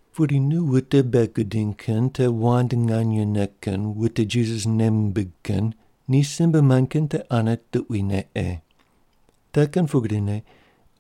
Pudi nu wute bei gudiny kin te wand nganyene kin wute Jisas nei mimbig kin ni simbe mand kin te ane tuquine ei. Te kin pugrine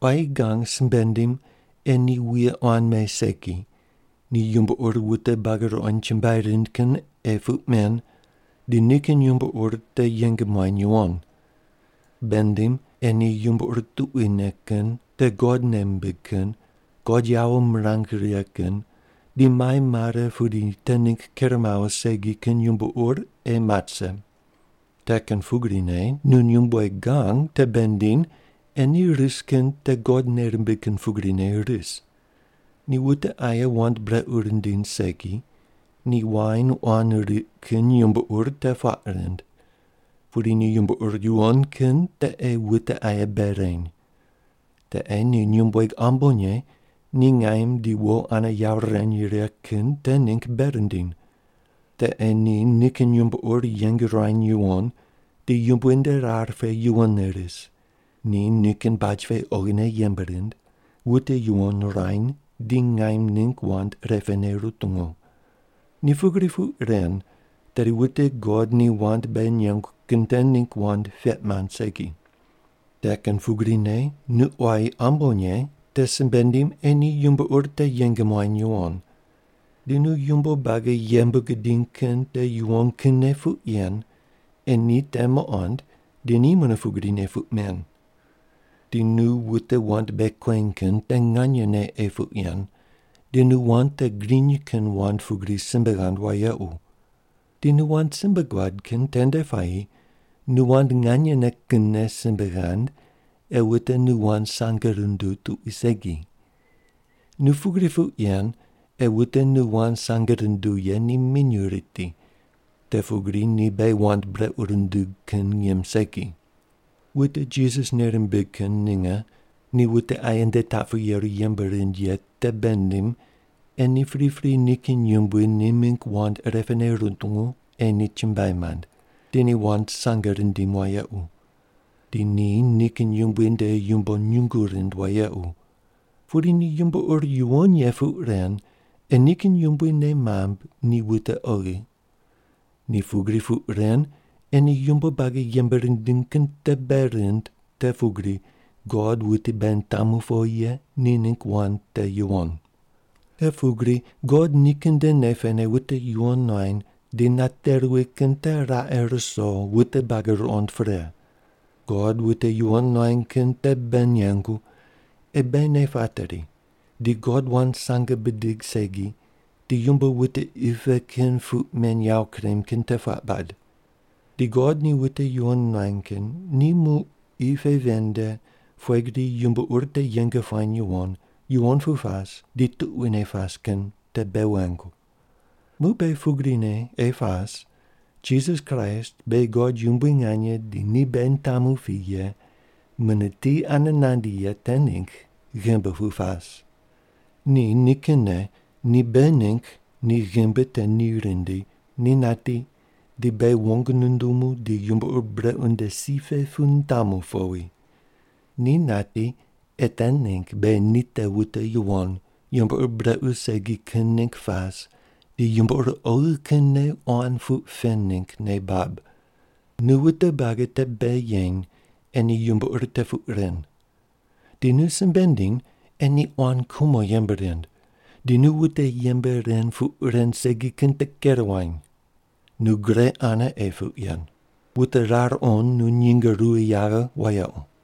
quayi gang simbe ndim ei ni wuye quan me segi, ni yumbo ur wute buagi ruqond chumbuai rind kin ei puq men di nikin yumbo ur te yeng muany yuwon. Bei ndim ei ni yumbo ur tuquine kin, te God nei mimbig kin, God yawo mirang righe kin di mai mare pudi te ningg ker mawo segi kin yumbo ur ei mat rise. Te kin pugrine nu nyumbueg gang te bei ndiny ei ni ris kin te God nei rimbig kin pugrine ris. Ni wute aye wand brequ rindiny segi, di wain quan riq kin yumbo ur te puaq rind. Pudi ni yumbo ur yuwon kin te ei wute aye bei reny. Te ei ni nyumbueg ambonye ni ngaim di wo ane yawo rirany righe kin te ningg bei rindiny. Te ei ni nikin yumbo ur yeng ruany yuwon di Yumbui nde rar pe yuwonne ris, ni nikin baj pe oghine yembe rind, wute yuwon ruany di ngaim ningg wand irepene rutungu. Ni pugri puq ren tedi wute God ni wand beghi nengu kin te ningg wand peq mand segi. Te kin pugrine nu quayi ambonye te simbe ndim ei ni yumbo ur te yeng muany yuwon. Di nu yumbo buagi yembe gudiny kin te yuwon kinne puq yen ei ni te muqond di ni mune pugrine puq men. Di nu wute wand bei kueny kin te nganyene ei puq yen di nu wand te griny kin wand pugri simbe ghand wayequ. Di nu wand simbe guad kin tende puayi nu wand nganyene kinne simbe ghand ei wute nu wand sange runduw tuqui segi. Nu pugri puq yen ei wute nu wand sange runduw ye ni minyuw riti, te pugri ni beghi wand brequ rundug kin ngim segi. Wute Jisas nei rimbig kin ninge ni wute aye nde taq pu yeru yembe rind ye te bei ndiny ei ni pripri nikin yumbui ni mingg wand irepene rutungu ei ni chumbuai mand, di ni wand sange rindim wayequ. Di ni nikin yumbui nde yumbo nyungu rind wayequ. Pudi ni yumbo ur yuwon ye puq ren ei nikin yumbui nei mamb ni wute oghi. Ni pugri puq ren ei ni yumbo buagi yembe rindiny kin te bei rind te pugri God wuti beghi nitamu powi ye ni ningg wand te yuwon. Te pugri God nikin nde nei pene wute yuwon nuany di nate ruwi kin te raqe ruso wute buagi ruqond pre. God wute yuwon nuany kin te bei nengu ei beghi nei pateri di God wand sange bidig segi di yumbo wute qi pe kin puq men yawo kurem kin te puaq bad. Di God ni wute yuwon nuany kin ni muq qi pe ven nde pughe gri yumbo ur te yeng puany yuwon, yuwon pu pas di tuquine pas kin te bei wengu. Muq beghi pugrine ei pas Jisas Kraist beghi God yumbui nganye di ni beghi nitamu pi ye, mune ti ane nandi ye te ningg ghimbi pu pas. Ni nikinne ni beghi ningg ni ghimbi te ni rindi, ni nati di beghi wong nundumu di yumbo ur brequ nde si pe pu nitamu powi. Ni nati ei te ningg beghi ni te wute yuwon, yumbo ur brequ segi kin ningg pas di yumbo ur oghi kinne quan puq pen ningg nei bab. Nu wute buagi te bei yeny ei ni yumbo ur te puq ren. Di nu simbe ndiny ei ni quan kumo yembe rind, di nu wute yembe ren puq ren segi kin te ker wuany. Nu gre ane ei puq yen. Wute rar qond nu nyinge ruwi yaghe wayequ.